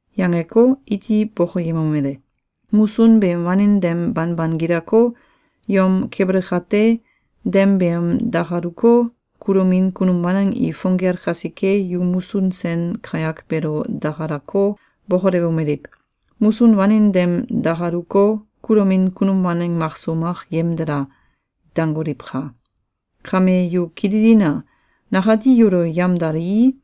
Yangeko, iti bokoyemomele: “Musun beem wanin dem banban gilako, yom keble kate, dem beem dakaluko, kulomin kunum waneng i fong gel kasike, yu musun sen kayak beelo dakalako, bokolewomeliw: ‘Musun wanin dem dakaluko, kulomin kunum waneng makso mak yemdala!’, dangoliwka! Kame yu kililina! Nakati yulo yamdalii,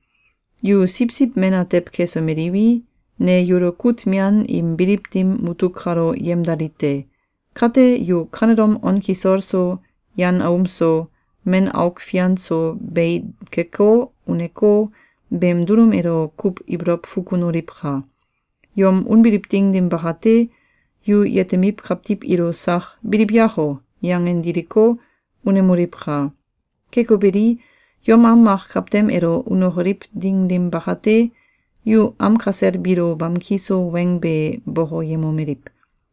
yu siwsiw men atew kesomeliwi, ne yulo kut mian im biliw dim mutuk kalo yemdali te. Kate, yu kanelom on kisol so, yan aum so, men auk fian so bei keko, uneko, beem dulum elo kuw ibolow fukunoliwka! Yom unbiliw ding dim bakate, yu yetemiw kawtiw ilo sak ‘Biliw yako!’ yangen diliko, unemoliwka! Keko beli, yom am mak kawtem elo unokoliw ding dim bakate, yu am kasel biilo bamki so weng be bokoyemomeliw: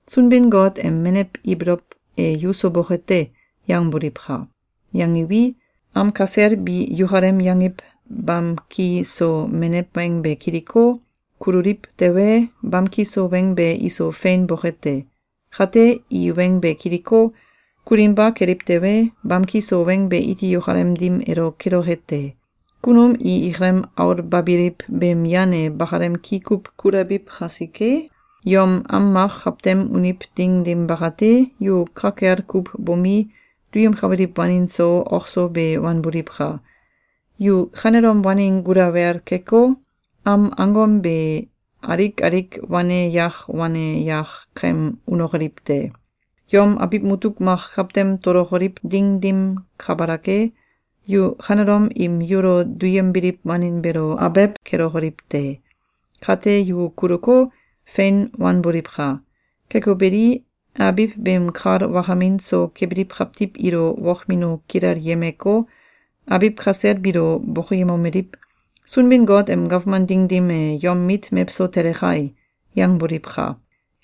“Sunbin-Got em menew ibolow e yuso boke te!’, yangboliwka! Yangiwi, am kasel bi yukalem yangiw bamki so menew weng be kiliko, kululiw tewe, bamki so weng be iso fein boke te. Kate, i weng be kiliko, kulinba keliw tewe, bamki so weng be iti yukalem dim elo keloke te. Kunum i ikalem aulbabiliw beem yan e bakalem ki kuw kulabif kasike, yom am mak kawtem uniw ding dim bakate, yu ka kel kuw bomi, duyemkabiliw wanin so, ok so be wanboliwka! Yu kanelom wanin gulawel keko, am angom be alik alik wane yak wane yak kem unokoliw te! Yom abiw mutuk mak kawtem tolokoliw ding dim kabalak e, yu kanelom im yulo duyembiliw wanin beelo abew kelokoliw te! Kate, yu kuluko, fein wanboliwka! Keko beli, abiw beem kal wakamin so kebiliw kawtiw ilo wokmino kilelyemeko, abiw kasel biilo bokoyemomeliw: ‘Sunbin-Got em gawman ding dim e yom mit mewso tele kai!’, yangboliwka!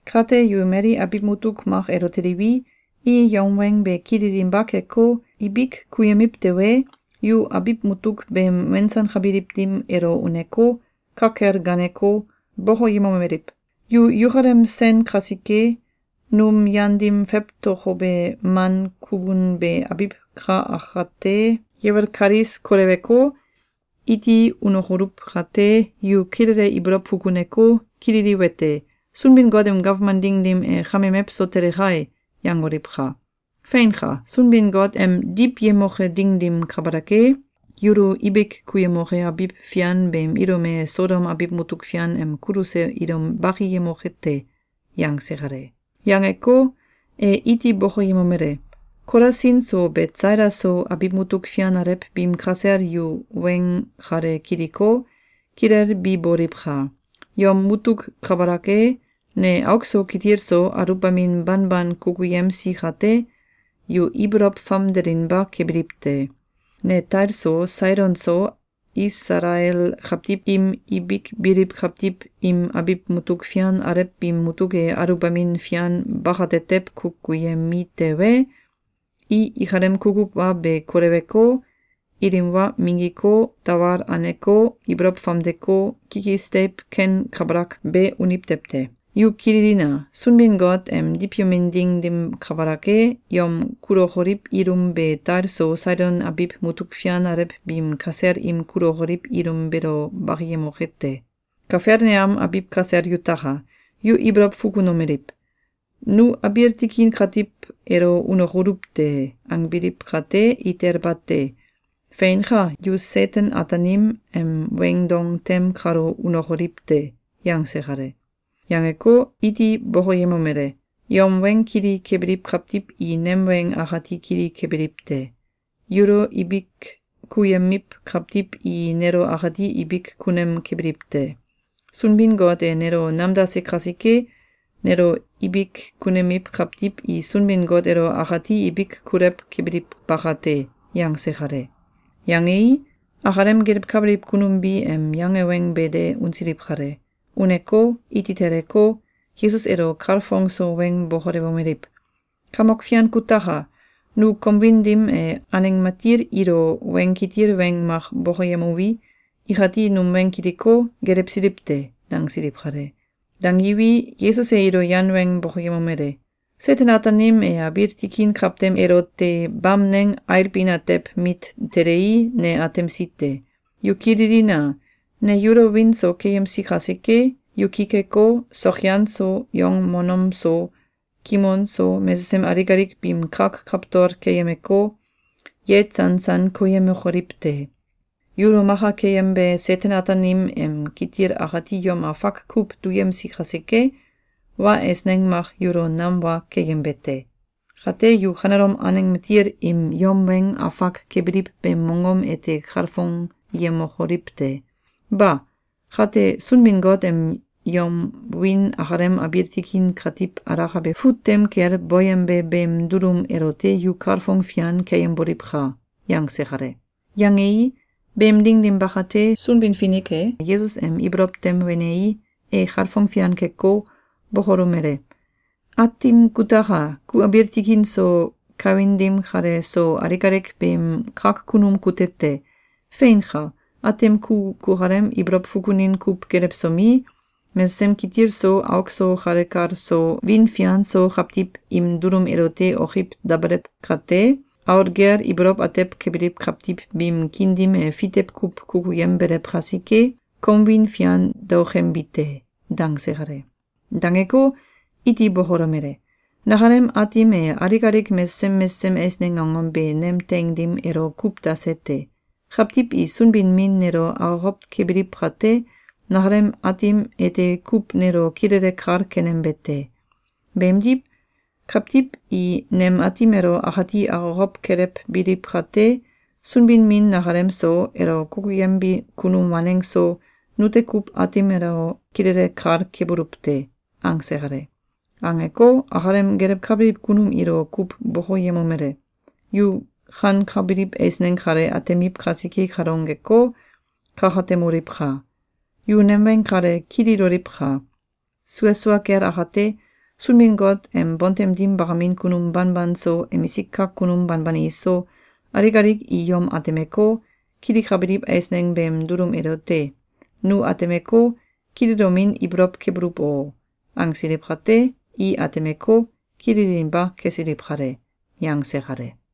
Kate, yu mali abiw mutuk mak elo teliwi, i yom weng be kililinba keko, ibik kuyemiw tewe, yu abiw mutuk beem wensankabiliw dim elo uneko, ka kel gaaneko, bokoyemomeliw: ‘Yukalem sen kasike, num yan dim fewtokobe man kukun be abiw ka akate yewel kalis koleweko, iti unokoluw kate, yu kilele ibolow fukuneko, kililiwete: ‘Sunbin-Got em gawman ding dim e kame mewso tele kai!’, yangoliwka! Feinka! Sunbin-Got em diwyemoke ding dim kabalak e, yulo ibik kuyemoke abiw fian beem ilum e Sodom abiw mutuk fian em kuluse ilum bakiyemoke te!”, yangse kale. Yangeko, e iti bokoyemomele: “Kolasin so Betsaida so, abiw mutuk fian alew biim kasel yu weng kale kiliko, kilelbiboliwka! Yom mutuk kabalak e, ne auk so kitil so aluwbamin banban kukuyemsi kate, yu ibolow famdelinba kebiliw te. Ne Tail so Saidon so Isalael kawtiw im ibik biliw kawtiw im abiw mutuk fian alew biim mutuk e aluwbamin fian bakatetew kukuyemi tewe, i ikalem kukuw wa be koleweko, ilim wa minggiko, tawal aneko, ibolow famdeko, kikis deiw ken kabalak be uniw tew te. Yu kililina! Sunbin-Got em diwyemin ding dim kabalak e, yom kulokoliw ilum be Tail so Saidon abiw mutuk fian alew biim kasel im kulokoliw ilum beelo bakiyemoke te. Kafelneam abiw kasel yutaka! Yu ibolow fukunomeliw: ‘Nu abiil tikin katiw elo unokoluw te!’, angbiliw kate, itel bate! Feinka! Yu Seten-Ataanim em weing dong tem kalo unokoliw te!”, yangse kale. Yangeko, iti bokoyemomele: “Yom weng kili kebiliw kawtiw i nem weng akati kili kebiliw te. Yulo ibik kuyemiw kawtiw i nelo akati ibik kunem kebiliw te. Sunbin-Got e nelo namdase kasike, nelo ibik kunemiw kawtiw i Sunbin-Got elo akati ibik kulew kebiliw bakate.”, yangse kale. Yangei, akalem gelewkabiliw kunum bi em yange weng be de unsiliw kale. Uneko, iti teleko, Yesus elo kalfong so weng bokolewomeliw: “Kamok Fian kutaka! Nu kom wiin dim e aneng matil ilo weng kitil weng mak bokoyemuwi, ikati num weng kiliko, gelewsiliw te!”, dangsiliw kale. Dangiwi, Yesus e ilo yan weng bokoyemomele: “Seten-Ataanim e abiil tikin kawtem elote bamneng ailbin atew mit telei, ne atemsi te. Yu kililina! Ne yulo wiin so keyemsi kasike, yu ki keko, sokyan so, yongmonom so, kimon so mesesem alik alik biim kak kawtol keyemeko, yeitsansan koyemokoliw te. Yulo maka keyembe Seten-Ataanim em kitil akati yom afak kuw duyemsi kasike, wa eisneng mak yulo nam wa keyembe te. Kate, yu kanelom aneng matil im yom weng afak kebiliw beem mongom ete kalfongyemokoliw te. Ba! Kate, Sunbin-Got em yom wiin akalem abiil tikin katiw alakabe fut tem kel boyembe beem dulum elote yu kalfong fian keyemboliwka!”, yangse kale. Yangei, beem ding dim bakate, Sunbin-Finik e Yesus em ibolow tem wenei, e kalfong fian keko, bokolomele: “Aatim kutaka! Ku abiil tikin so kawin dim kale so alik alik beem kak kunum kute te! Feinka! Aatim ku kukalem ibolow fukunin kuw gelewsomi, mesesem kitil so auk so kale kal so wiin fian so kawtiw im dulum elote okiw dabelew kate, aul gel ibolow atew kebiliw kawtiw biim kiin dim e fitew kuw kukuyembelew kasike, kom wiin fian daokembi te.”, dangse kale. Dangeko, iti bokolomele: “Nakalem aatim e alik alik mesesem mesesem eisneng angom be nem teing dim elo kuw dase te. Kawtiw i Sunbin-Min nelo akokow kebiliw kate, nakalem Aatim ete kuw nelo kilele kal kenembe te. Beemdiw, kawtiw i nem Aatim elo akati akokow kelewbiliw kate, Sunbin-Min nakalem so, elo kukuyembi kunum waneng so, nute kuw Aatim elo kilele kal kebuluw te.”, angse kale. Angeko, akalem gelewkabiliw kunum ilo kuw bokoyemomele: “Yu kankabiliw eisneng kale atemiw kasike kalongeko, kakatemoliwka! Yu nem weng kale kililoliwka! Sua sua kel akate, Sunbin-Got em bontem dim bakamin kunum banban so, emisik kak kunum banban iso, alik alik i yom atemeko, kilikabiliw eisneng beem dulum elote ‘Nu atemeko, kililomin ibolow kebuluw o!’, angsiliw kate, i atemeko, kililinba kesiliw kale.”, yangse kale.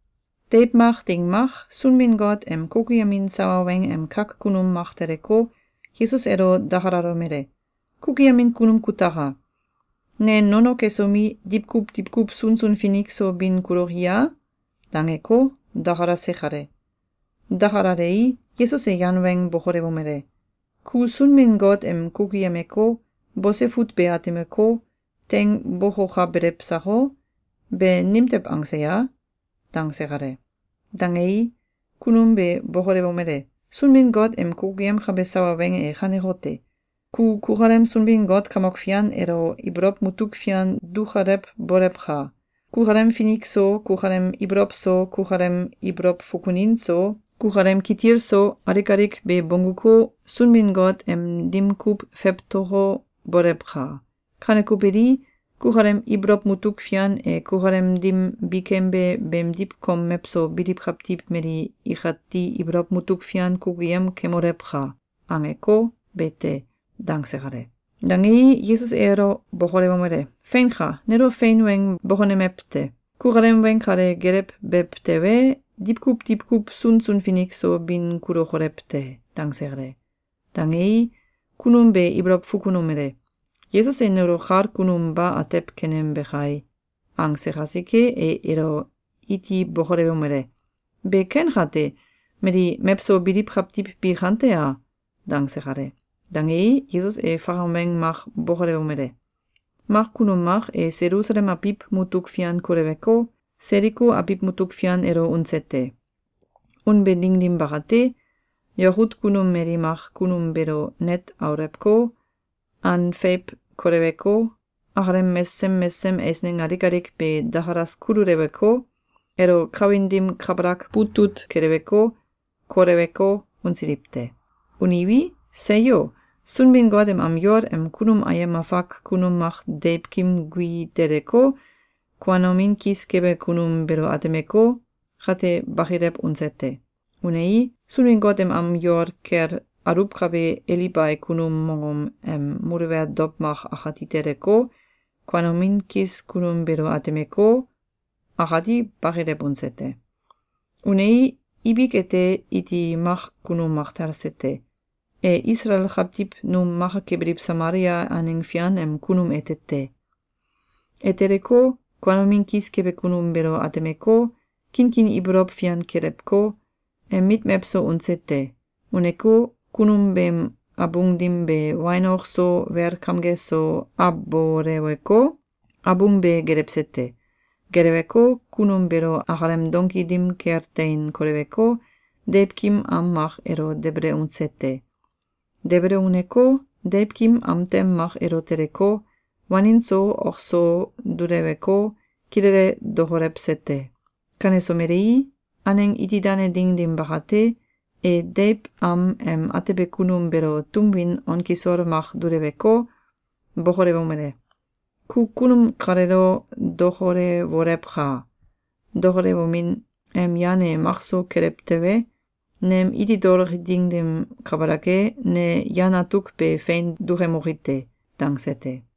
Deiw mak ding mak, Sunbin-Got em kukuyemin sawa weng em kak kunum mak teleko, Yesus elo dakalalomele: “Kukuyemin kunum kutaka! Ne nono kesomi, diwkuw diwkuw sunsun finik so bin kuloki a?”, dangeko, dakalase kale. Dakalalei, Yesus e yan weng bokolewomele: “Ku Sunbin-Got em kukuyemeko, bose fut be atemeko, teing bokokabelew sako? Be nimtew angse ya?”, dangse kale. Dangei, kunum be bokolewomele: “Sunbin-Got em kukuyemkabe sawa weng e kanekote: Ku kukalem Sunbin-Got Kamok Fian elo ibolow mutuk fian dukalewbolewka! Kukalem finik so, kukalem ibolow so, kukalem ibolow fukunin so, kukalem kitil so, alik alik be bongguko, Sunbin-Got em dim kuw fewtoko, bolewka! Kaneko beli, kukalem ibolow mutuk fian e kukalem dim bikembe beemdiw kom mewso biliw kawtiw mali ikati ibolow mutuk fian kukuyem kemolewka! angeko, be te.”, dangse kale. Dangei, Yesus e elo bokolewomele: “Feinka! Nelo fein weng bokonemew te! Kukalem weng kale gelewbew tewe, diwkuw diwkuw sunsun finik so bin kulokolew te!”, dangse kale. Dangei, kunum be ibolow fukunomele: “Yesus e nelo kal kunum ba atew kenembe kai!”, angse kasike, e elo iti bokolewomele: “Be ken kate, mali mewso biliw kawtiw bi kante a?”, dangse kale. Dangei, Yesus e fakam weng mak bokolewomele: “Mak kunum mak e Selusalem abiw mutuk fian koleweko, Seliko abiw mutuk fian elo unse te. Unbe ding dim bakate, yakut kunum mali mak kunum beelo net aulewko, an feiw koleweko, akalem mesesem mesesem eisneng alik alik be dakalas kululeweko, elo kawin dim kabalak butut keleweko, koleweko, unsiliw te. Uniwi, seyo!, Sunbin-Got em am yol em kunum ayem afak kunum mak deiwkim gui teleko, kuanomin kis kebe kunum beelo atemeko, — kate bakilew unse te. Unei, Sunbin-Got em am yol kel aluwkabe Elibai kunum mongom em muluwel dow mak akati teleko, kuanomin kis kunum beelo atemeko, — akati bakilew unse te. Unei, ibik ete, iti mak kunum mak talse te. E Isalael kawtiw num maka kebiliw Samalia aneng fian em kunum ete te. E teleko, kuanomin kis kebe kunum beelo atemeko, kinkin ibolow fian kelewko, em mit mewso unse te. Uneko, kunum beem abung dim be wain ok so wel kamge so aboleweko, abung be gelewse te. Geleweko, kunum beelo akalem donki dim kel tein koleweko, deiwkim am mak elo debele unse te. Debele uneko, deiwkim am tem mak elo teleko, wanin so ok so duleweko, kilele dokolewse te. Kanesomelei, aneng iti dane ding dim bakate, e deiw am em atebe kunum beelo tum win on kisol mak duleweko, bokolewomele: ‘Ku kunum kaleelo dokolewolewka! Dokolewomin em yan e makso kelew tewe, nem iti toloki ding dim kabalak e, ne yan atuk be fein dukemoki te.’, dangse te.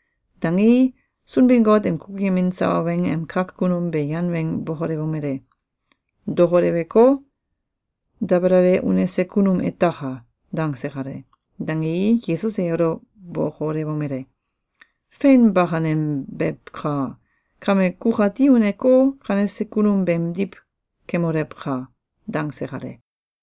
Dangei, Sunbin-Got em kukuyemin sawa weng em kak kunum be yan weng bokolewomele: “Dokoleweko, debelale unese kunum etaka!”, dangse kale. Dangei, Yesus e elo bokolewomele: “Fein bakanembewka! Kame kukati uneko, kanese kunum beemdiw kemolewka!”, dangse kale.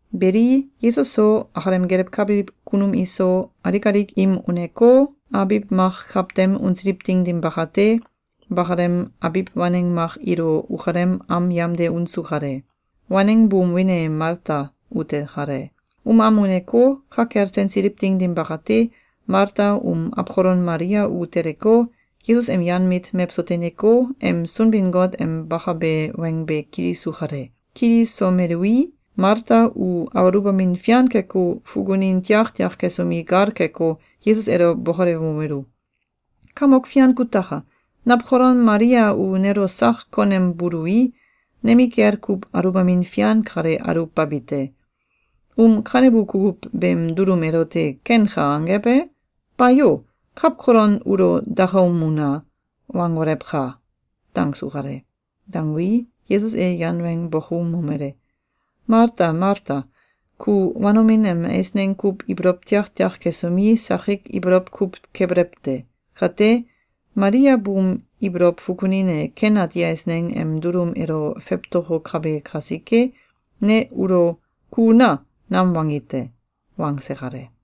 Beli, Yesus so, akalem gelewkabiliw kunum iso, alik alik im uneko, abiw mak kawtem unsiliw ding dim bakate, bakalem abiw waneng mak ilo ukalem am yamde unsu kale. Waneng buum wiin e Malta ute kale. Um am uneko, ka kel teinsiliw ding dim bakate, Malta um awkolon Malia u teleko, Yesus em yan mit mewso teineko, em Sunbin-Got em bakabe weng be kilisu kale. Kilisomelui, Malta u aluwbamin fian keko, fukunin tiaktiak kesomi, gal keko, Yesus elo bokolewomelu: “Kamok Fian kutaka! Nawkolon Malia u nelo sak konembului, nemikel kuw aluwbamin fian kale aluwbabi te. Um kanebu kukuw beem dulum elote ‘Kenka!’, angew e? Bayo! ‘Kawkolon ulo dakaum una!’, wangolewka!”, dangsu kale. Dangui, Yesus e yan weng bokoumomele: “Malta, Malta! Ku wanomin em eisneng kuw ibolow tiaktiak kesomi, sakik ibolow kuw kebelew te. Kate, Malia buum ibolow fukunin e ken ati eisneng em dulum elo fewtokokabe kasike, ne ulo ‘Ku una!’, nam wangi te!”, wangse kale.